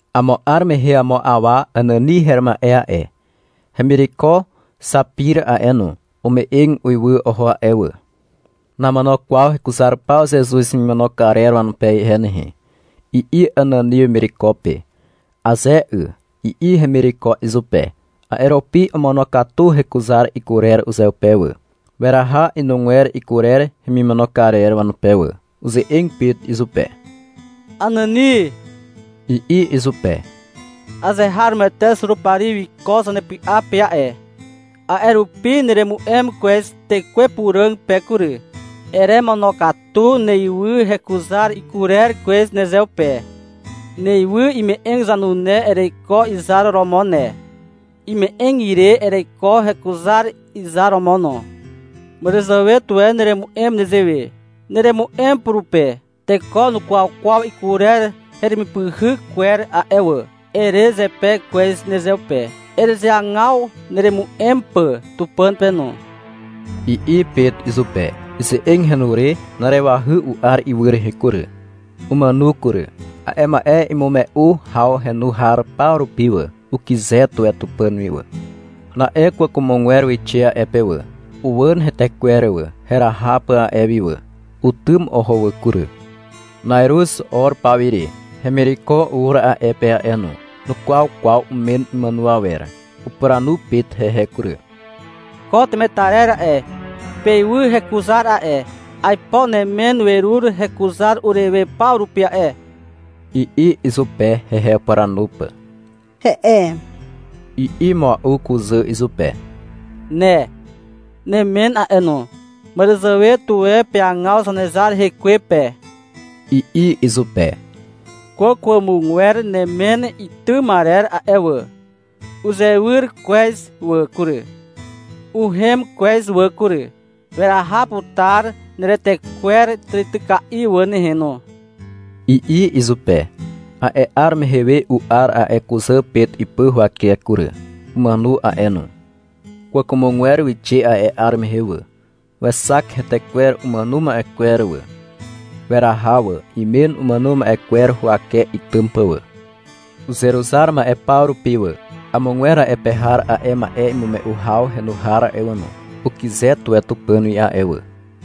Amo 'ar mehe amo awa Anani her ma'e a'e, hemireko Xapir a'e no, ume'eg uiwy oho a'e wà. — Namono kwaw hekuzar paw Zezuz hemimono karer wanupe ihe nehe, i'i Anani wemireko pe. — Aze 'y, i'i hemireko izupe. A'e rupi omonokatu hekuzar ikurer uzeupe wà. Weraha inugwer ikurer hemimono karer wanupe wà. Uze'eg Pet izupe. — Anani, i'i izupe. — Azeharomoete Zurupari wiko nepy'a pe a'e. A'e rupi neremu'em kwez Tekwe Puràg pe kury. Eremonokatu neywy hekuzar ikurer kwez nezeupe. Neywy ime'eg zanune ereiko izar romo ne. Ime'eg ire ereiko hekuzar izar romo no. Màràzàwe tuwe neremu'em nezewe. Neremu'em purupe. — Teko nukwaw kwaw ikurer heremipyhyk kwer a'e wà, ere zepe kwez nezeupe. Erezeagaw neremu'em pà Tupàn pe no, i'i Pet izupe. Ize'eg henu re na'arewahy u'ar ywy rehe kury. Umàno kury. A'e ma'e imume'u haw henu har paw rupi wà, ukyze tuwe Tupàn wi wà. Na'e kwàkwàmogwer wixe a'e pe wà. Uwàn hetekwer wà, heraha pà a'e wi wà. Utym oho wà kury. Na'iruz 'or paw ire hemireko ur a'e pe a'e no. Nukwaw kwaw umen imàno awer. Upuranu Pet hehe kury. -Ko temetarer a'e, peywy hekuzar a'e. Aipo nemen werur hekuzar urewe paw rupi a'e, i'i izupe, hehe upuranu pà. — He'e, i'i mua'u kuzà izupe. — Ne, nemen a'e no, màràzàwe tuwe peagaw Zanezar rekwe pe, i'i izupe. Kwàkwàmogwer nemen itym arer a'e wà, uzewyr kwez wà kury, uhem kwez wà kury. Weraha putar neretekwer tàrityka'i wà nehe no, i'i izupe. A'e 'ar mehe we u'ar a'e kuzà Pet ipy huwake kury. Umàno a'e no. Kwàkwàmogwer wixe a'e 'ar mehe wà. Wexak hetekwer umàno ma'e kwer wà. Weraha wà, imen umàno ma'e kwer huwake itym pà wà. Uzeruzar ma'e paw rupi wà, amogwer a'e pe har a'e ma'e imume'u haw henu har a'e wà no, ukyze tuwe Tupàn wi a'e wà.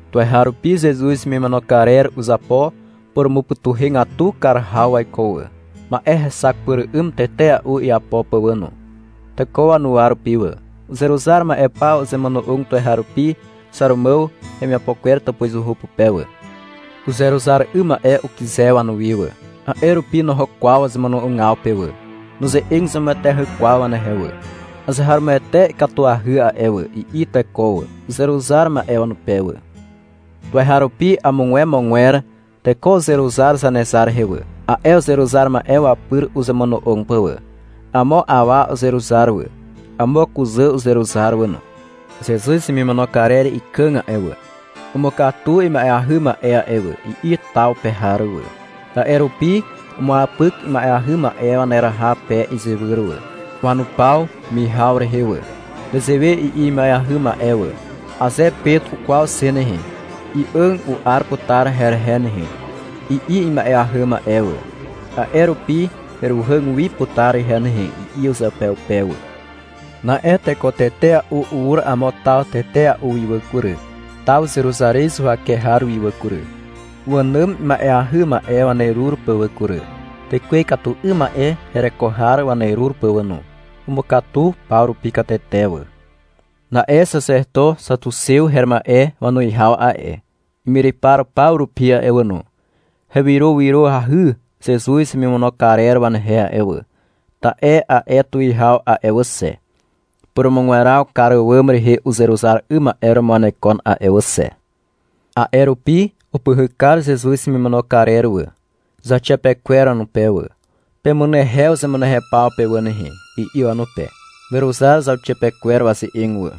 Tuweharupi Zezuz hemimono karer uzapo purumupytuhegatu kar haw waiko wà, ma'e hexak pyr 'ym tetea'u iapo pà wà no, teko wanuwa rupi wà. Uzeruzar ma'e paw uzemono'og tuweharupi Xàrumàw hemiapo kwer tàpuzuhu pupe wà. Uzeruzar 'ym ma'e ukyze wanuwi wà, a'e rupi noho kwaw wazemono'ogaw pe wà. Nuze'eg zemueteahy kwaw wanehe wà. — Azeharomoete ikatuahy a'e wà, i'i teko wà, uzeruzar ma'e wanupe wà. Tuweharupi amogwemogwer teko uzeruzar Zanezar rehe wà, a'e uzeruzar ma'e wapyr uzemono'og pà wà. Amo awa uzeruzar wà. Amo kuzà uzeruzar wà no. — Zezuz hemimono karer ikàg a'e wà, umukatu ima'eahy ma'e a'e wà, i'i taw pe har wà. A'e rupi umuapyk ima'eahy ma'e waneraha pe izywyr wà, wanupaw mihaw rehe wà. Nezewe i'i ima'eahy ma'e wà. — Aze Pet ukwaw xe nehe, i'àg u'ar putar herehe nehe, i'i ima'eahy ma'e wà. — A'e rupi heruhàg wi putar ihe nehe, i'i uzeupeupe wà. Na'e teko tetea'u ur amo taw tetea'u wi wà kury, taw Zeruzarez huwake har wi wà kury, wànàm ima'eahy ma'e wanerur pà wà kury, tekwe ikatu 'ym ma'e hereko har wanerur pà wà no. Umukatu paw rupi katete wà. Na'e xaxeto xatuxew her ma'e wanuwihaw a'e, imyrypar paw rupi a'e wà no, hewyrowyroahy Zezuz hemimono karer wanehe a'e wà, ta'e a'e tuwihaw a'e wà xe, purumugweraw kar àwàm rehe uzeruzar 'ym ma'e romo wanekon a'e wà xe. A'e rupi upyhyk kar Zezuz hemimono karer wà, zauxiapekwer wanupe wà. — Pemunehew zemunehew paw pe pe wà nehe, i'i wanupe. Weruzar zauxiapekwer waze'eg wà.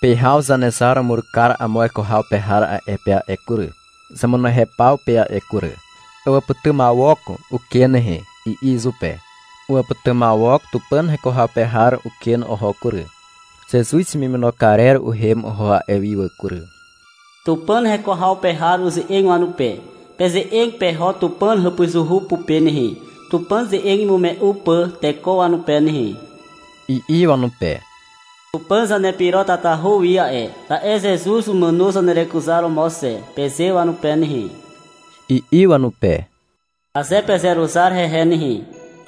Pyhaw Zanezar umur kar amo weko haw pe har a'e pe a'e kury, zemunehew paw pe a'e kury. Ewàpytymawok uken nehe, i'i izupe. Uwàpytymawok Tupàn heko haw pe har uken oho kury. Zezuz hemimono karer uhem oho a'e wi wà kury. Tupàn heko haw pe har uze'eg wanupe. — Peze'eg peho Tupàn hàpuzuhu pupe nehe, Tupàn ze'eg imume'u pà teko wanupe nehe, i'i wanupe. — Tupàn zanepyro tatahu wi a'e, ta'e Zezuz umàno zanerekuzaromo xe, peze wanupe nehe, i'i wanupe. — Aze pezeruzar hehe nehe,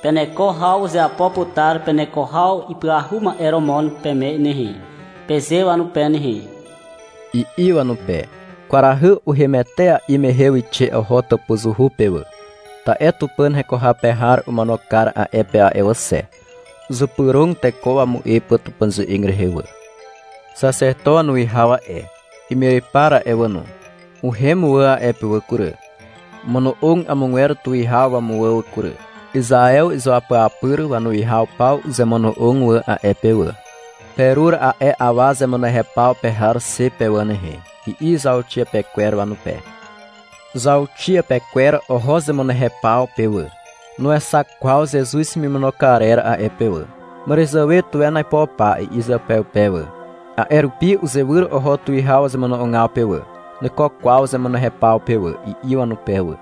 peneko haw uzeapo putar peneko haw ipyahu ma'e romo peme nehe, peze wanupe nehe, i'i wanupe. Kwarahy uhem etea'i mehe wixe oho tàpuzuhu pe wà. Ta'e Tupàn heko haw pe har omono kar a'e pe a'e wà xe. Uzypyrog teko wamu'e pà Tupàn ze'eg rehe wà. Xaxeto wanuwihaw a'e, imyrypar a'e wà no, uhem wà a'e pe wà kury. Omono'og amogwer tuwihaw wamuwà wà kury. Izaew izuapyapyr wanuwihaw paw uzemono'og wà a'e pe wà. — Perur a'e awa zemunehew paw pe har xe pe wà nehe, i'i zauxiapekwer wanupe. Zauxiapekwer oho zemunehew paw pe wà. Nuexak kwaw Zezuz hemimono karer a'e pe wà. — Màràzàwe tuwen aipo pa, i'i uzeupeupe wà. A'e rupi uzewyr oho tuwihaw wazemono'ogaw pe wà. — Nuiko kwaw zemunehew paw pe wà, i'i wanupe wà.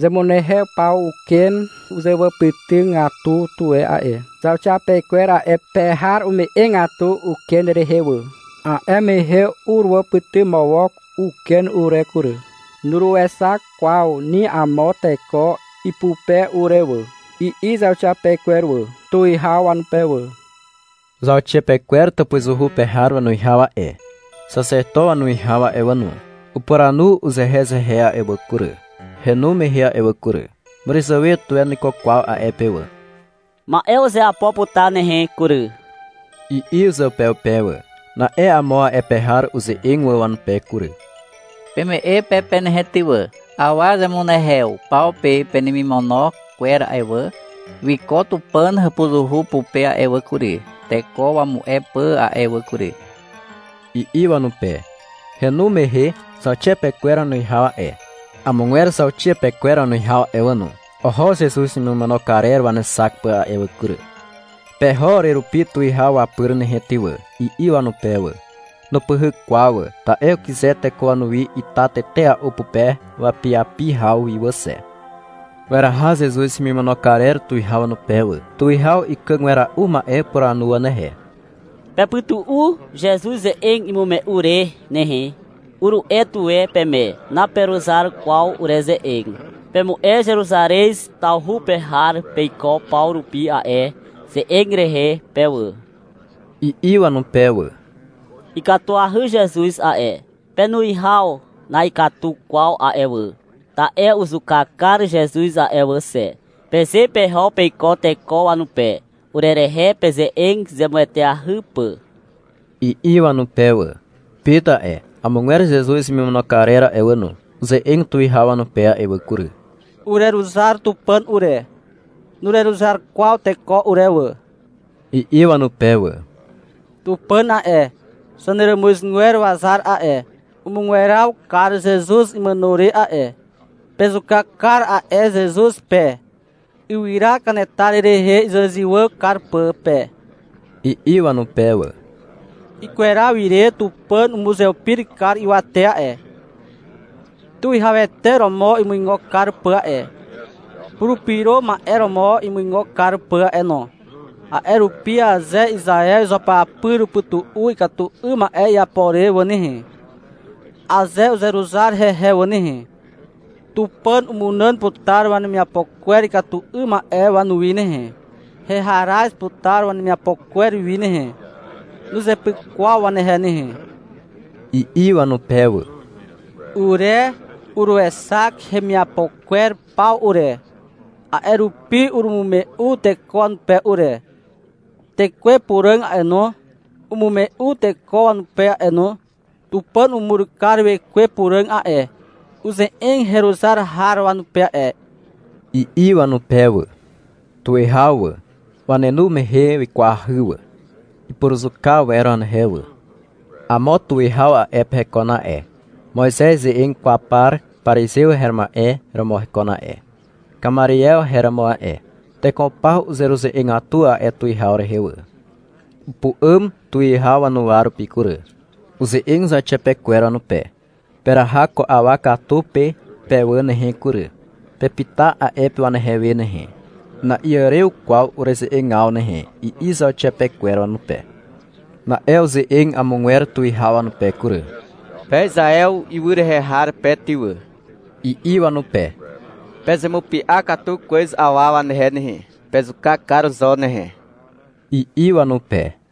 — Zemunehew paw uken uzewàpytygatu tuwe a'e. Zauxiapekwer a'e pe har ume'egatu uken rehe wà. A'e mehe uruwàpytymawok uken ure kury. Nuruexak kwaw ni amo teko ipupe ure wà, i'i zauxiapekwer wà, tuwihaw wanupe wà. Zauxiapekwer tàpuzuhu pe har wanuwihaw a'e, xaxeto wanuwihaw a'e wà no, upuranu uzehezehe a'e wà kury, henu mehe a'e wà kury. — Màràzàwe tuwe nuiko kwaw a'e pe wà. Ma'e uzeapo putar nehe kury, i'i uzeupeupe wà. Na'e amo a'e pe har uze'eg wà wanupe kury. -Peme'e pe pe nehe ty wà. Awa zemunehew paw pe penemimono kwer a'e wà, wiko Tupàn hàpuzuhu pupe a'e wà kury, teko wamu'e pà a'e wà kury, i'i wanupe. Henu mehe, zauxiapekwer wanuwihaw a'e, amogwer zauxiapekwer wanuwihaw a'e wà no, oho Zezuz hemimono karer wanexak pà a'e wà kury. — Peho urerupi tuwihaw wapyr nehe, ty wà, i'i wanupe wà. Nupyhyk kwaw wà, ta'e ukyze teko wanuwi ita tetea'u pupe wapiapi haw wi wà xe. Weraha Zezuz hemimono karer tuwihaw wanupe wà. Tuwihaw ikàg wera'u ma'e upuranu wanehe. — Pepytu'u Zezuz ze'eg imume'u re nehe, uru'e tuwe peme. — Naperuzar kwaw ureze'eg. Pemu'e Zeruzarez tawhu pe har peiko paw rupi a'e ze'eg rehe pe wà, i'i wanupe wà. — Ikatuahy Zezuz a'e. Penuwihaw na'ikatu kwaw a'e wà, ta'e uzuka kar Zezuz a'e wà xe, peze peho peiko teko wanupe, urerehe peze'eg zemueteahy pà, i'i wanupe wà. Pet a'e, amogwer Zezuz hemimono karer a'e wà no, uze'eg tuwihaw wanupe a'e wà kury. — Ureruzar Tupàn ure, nureruzar kwaw teko ure wà, i'i wanupe wà. — Tupàn a'e, zaneràmuzgwer wazar a'e, umugweraw kar Zezuz imàno re a'e. Pezuka kar a'e Zezuz pe, ywyra kanetar rehe izywàzywà kar pà pe, i'i wanupe wà. — Ikweraw ire Tupàn umuzeupir kar ywate a'e, Tuwihawete romo imuigo kar pà a'e, Purupyro Ma'e romo imuigo kar pà a'e no. A'e rupi aze Izaew izuapyapyr upytu'u ikatu 'ym ma'e iapo re wà nehe, (aze uzeruzar hehe wà nehe), Tupàn umunàn putar wanemiapo kwer ikatu 'ym ma'e wanuwi nehe, heharaz putar wanemiapo kwer wi nehe. Nuzepyk kwaw wanehe nehe, i'i wanupe wà. — Ure uruexak hemiapo kwer paw ure, a'e rupi urumume'u teko wanupe ure. Tekwe Puràg a'e no, umume'u teko wanupe a'e no. Tupàn umur kar Wekwe Puràg a'e, uze'eg heruzar har wanupe a'e, i'i wanupe wà. Tuwihaw wà, wanenu mehe wikwahy wà. Ipuruzuka wer wanehe wà. Amo tuwihaw a'e pe hekon a'e. Moizez ze'eg kwaw par parizew her ma'e romo hekon a'e, Kamariew her romo a'e. (Teko paw uzeruze'egatu a'e tuwihaw rehe wà.) Upu'àm tuwihaw wanuwa rupi kury. Uze'eg zauxiapekwer wanupe. — Peraha ko awa katu pe pe wà nehe kury. Pepyta a'e pe wanehe we nehe. Na'iàrew kwaw ureze'egaw nehe, i'i zauxiapekwer wanupe. Na'e uze'eg amogwer tuwihaw wanupe kury. -Pe Izaew ywy rehe har pe ty wà, i'i wanupe. — Pezemupy'a katu kwez awa wanehe nehe. Pezuka kar zo nehe, i'i wanupe.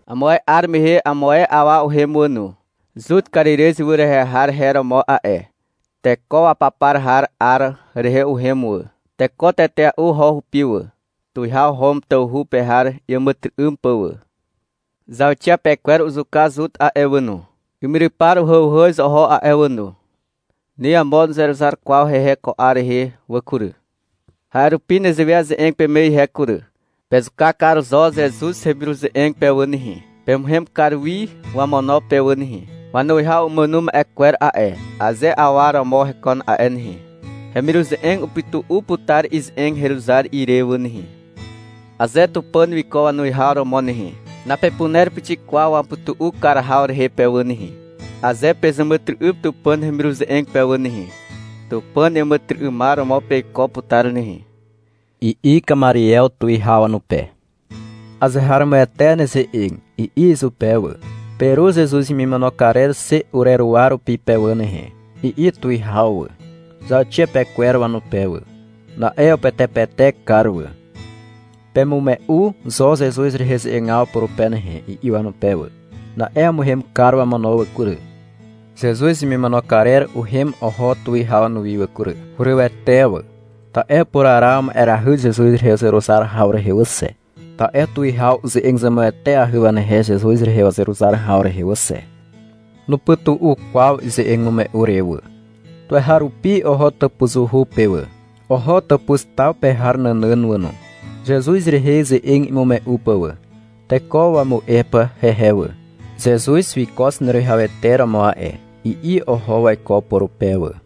— Amo ae 'ar mehe amo ae awa uhem wà no. Zut Karirez ywy rehe har her romo a'e. Teko wapapar haw 'ar rehe uhem wà. Teko tetea'u oho hupi wà, tuwihaw Hom tawhu pe har iàmàtyry'ym pà wà. Zauxiapekwer uzuka Zut a'e wà no. Imyrypar uhàuhàz oho a'e wà no. (Ni amo nuzeruzar kwaw hehe ko 'ar rehe wà kury.) A'e rupi nezewe aze'eg peme ihe kury. Pezuka kar zo Zezuz hemiruze'eg pe wà nehe. Pemuhem kar wi wamono pe wà nehe. Wanuwihaw umàno ma'e kwer a'e, aze awa romo hekon a'e nehe, hemiruze'eg upytu'u putar ize'eg heruzar ire wà nehe. Aze Tupàn wiko wanuwihaw romo nehe, napepuner pixik kwaw wamupytu'u kar haw rehe pe wà nehe. Aze pezàmàtyry'ym Tupàn hemiruze'eg pe wà nehe, Tupàn iàmàtyry'ymar romo peiko putar nehe, i'i Kamariew tuwihaw wanupe. — Azeharomoete neze'eg, i'i izupe wà. — Perur Zezuz hemimono karer xe ureruwa rupi pe wà nehe, i'i tuwihaw wà, zauxiapekwer wanupe wà. Na'e upetepetek kar wà. — Pemume'u zo Zezuz rehe ze'egaw purupe nehe, i'i wanupe wà. Na'e umuhem kar wamono wà kury. Zezuz hemimono karer uhem oho tuwihaw wanuwi wà kury. Hurywete wà, ta'e upuraraw ma'erahy Zezuz rehe uzeruzar haw rehe wà xe, ta'e tuwihaw uze'eg zemueteahy wanehe Zezuz rehe wazeruzar haw rehe wà xe. Nupytu'u kwaw ize'eg imume'u re wà. Tuweharupi oho tàpuzuhu pe wà, oho tàpuz taw pe har nànàn wà no, Zezuz rehe ze'eg imume'u pà wà, teko wamu'e pà hehe wà. — Zezuz wiko Zaneruwihawete romo a'e, i'i oho waiko purupe wà.